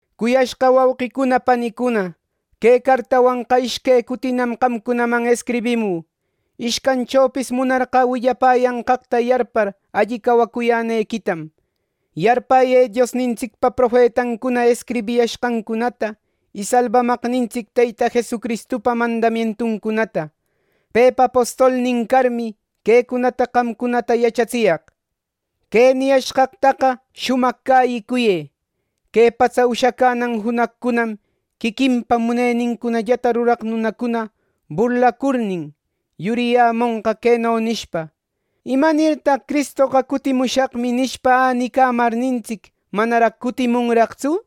Cuyashqa wauqicuna panicuna, que cartawanqa ishque cutinam qamcunaman escribimü. Ishcanchopis munarqä willapäyanqaqta yarpar alli cäyicuyänequitam. Yarpäyë Diosnintsicpa profetancuna escribishqancunata, y Salbamaqnintsic Teyta Jesucristupa mandamientuncunata. Pepa apostolnin carmi, quecunata qamcunata yachatsiyaq. Que niyashqaqta shumaq cäyicuyë. Que patsa ushacänan junaqcunam quiquinpa munenincunallata ruraq nunacuna burlacurnin, yuriyämonqa, queno nishpa: “¿Imanirtaq Cristoqa ‘Cutimushaqmi’ nishpa, änicamarnintsic manaraq cutimunraqtsu?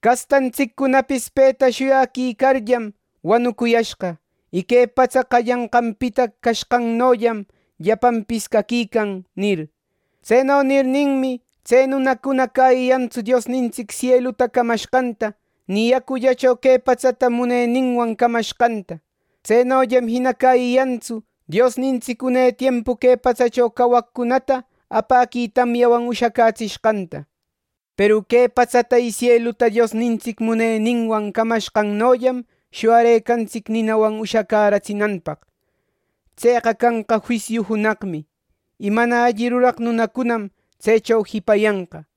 Castantsiccunapis peta shuyaquicarllam wanucuyashqa. Y que patsa qallananpita cashqannollam llapanpis caquican” nir. Tseno nirninmi, tse nunacuna cäyiyantsu Diosnintsic sieluta camashqanta, ni yacullacho que patsata muneninwan camashqanta. Tsenollam jina cäyiyantsu Diosnintsic une tiempu que patsacho cawaqcunata apäqui tamyawan ushacätsishqanta. Peru que patsata y sieluta Diosnintsic muneninwan camashqannollam shuyarëcatsin ninawan ushacäratsinanpaq. Tseqa canqa juisiu junaqmi; y mana alli ruraq nunacunam tsecho jipayanqa.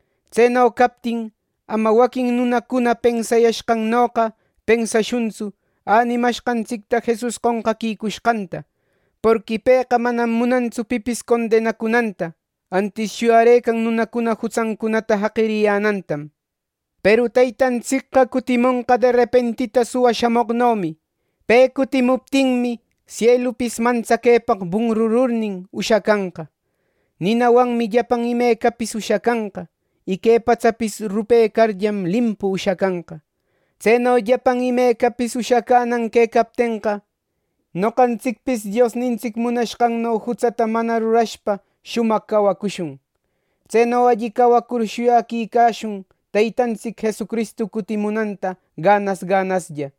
Tseno captin, ama waquin nunacuna pensayashqannoqa pensashuntsu änimashqantsicta Jesus qonqaquicushqanta. Porqui pëqa manam munantsu pipis condenacunanta; antis shuyarëcan nunacuna jutsancunata jaqiriyänantam. Peru Teytantsicqa cutimonqa derepentita suwa shamoqnomi. Pe cutimuptinmi, sielupis mantsaquepaq bunrururnin ushacanqa. Ninawanmi llapan imecapis ushacanqa. Y que patsapis rupecarllam, limpu ushacanqa. Tseno llapan imecapis ushacänan quecaptenqa, ¡noqantsicpis Diosnintsic munashqanno jutsata manana rurashpa shumaq cawacushun! Tseno alli cawacur shuyaquicashun Teytantsic Jesucristu cutimunanta ganas ganaslla.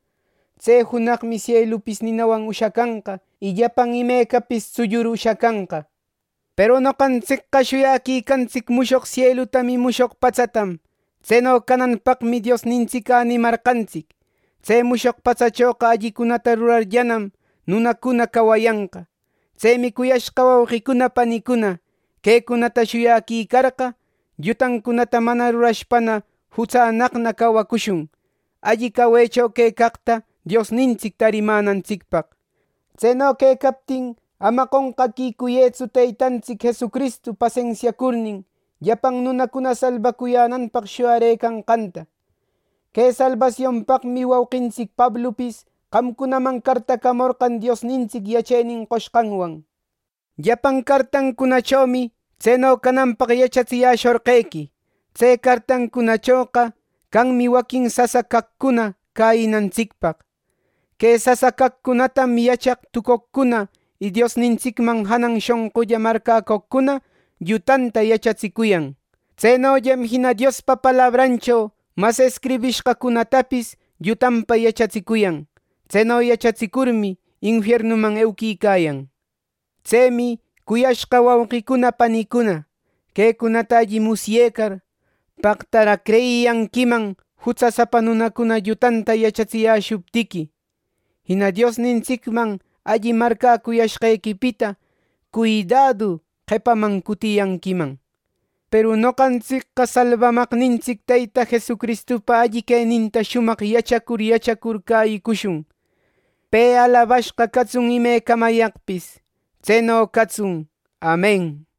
Tse junaqmi sielupis ninawan ushacanqa, y llapan imecapis tsullur ushacanqa. Peru noqantsicqa shuyaquicantsic mushoq sielutam y mushoq patsatam. Tseno cananpaqmi Diosnintsic änimarqantsic. Tse mushoq patsachoqa allicunata rurarllanam, nunacuna cawayanqa. Tsemi cuyashqa wauqicuna panicuna, quecunata shuyaquicarqa, llutacunata mana rurashpana jutsannaqna cawacushun, alli cawecho quecaqta Diosnintsic tarimänantsicpaq. Tseno quecaptin ama qonqaquicuyëtsu Teytantsic Jesucristoqa pasensiacurnin, llapan nunacuna salbacuyänanpaq shuyarëcanqanta. Que salbasionpaqmi wauqintsic Pablupis qamcunaman cartacamorqan Diosnintsic yachenin qoshqanwan. Llapan cartancunachomi tseno cananpaq yachatsiyäshorqequi. Tse cartancunachoqa canmi waquin sasa caqcuna cäyinantsicpaq. Que sasa caqcunatam yachaq tucoqcuna y Diosnintsicman janan shonqulla marcäcoqcuna llutanta yachatsicuyan. Tsenollam jina Diospa palabrancho mas escribishqacunatapis llutanpa yachatsicuyan. Tseno yachatsicurmi, infiernuman euquicayan. Tsemi, cuyashqa wauqicuna panicuna, quecunata alli musyecar, ¡paqtaraq creyiyanquiman jutsasapa nunacuna llutanta yachatsiyäshuptiqui! Jina Diosnintsicman alli marcäcuyashqequipita cuidadu qepaman cutiyanquiman. Peru noqantsicqa Salbamaqnintsic Teyta Jesucristupa alli queninta shumaq yachacur yachacur cäyicushun. ¡Pe alabashqa catsun imecamayaqpis! Tseno catsun. Amen.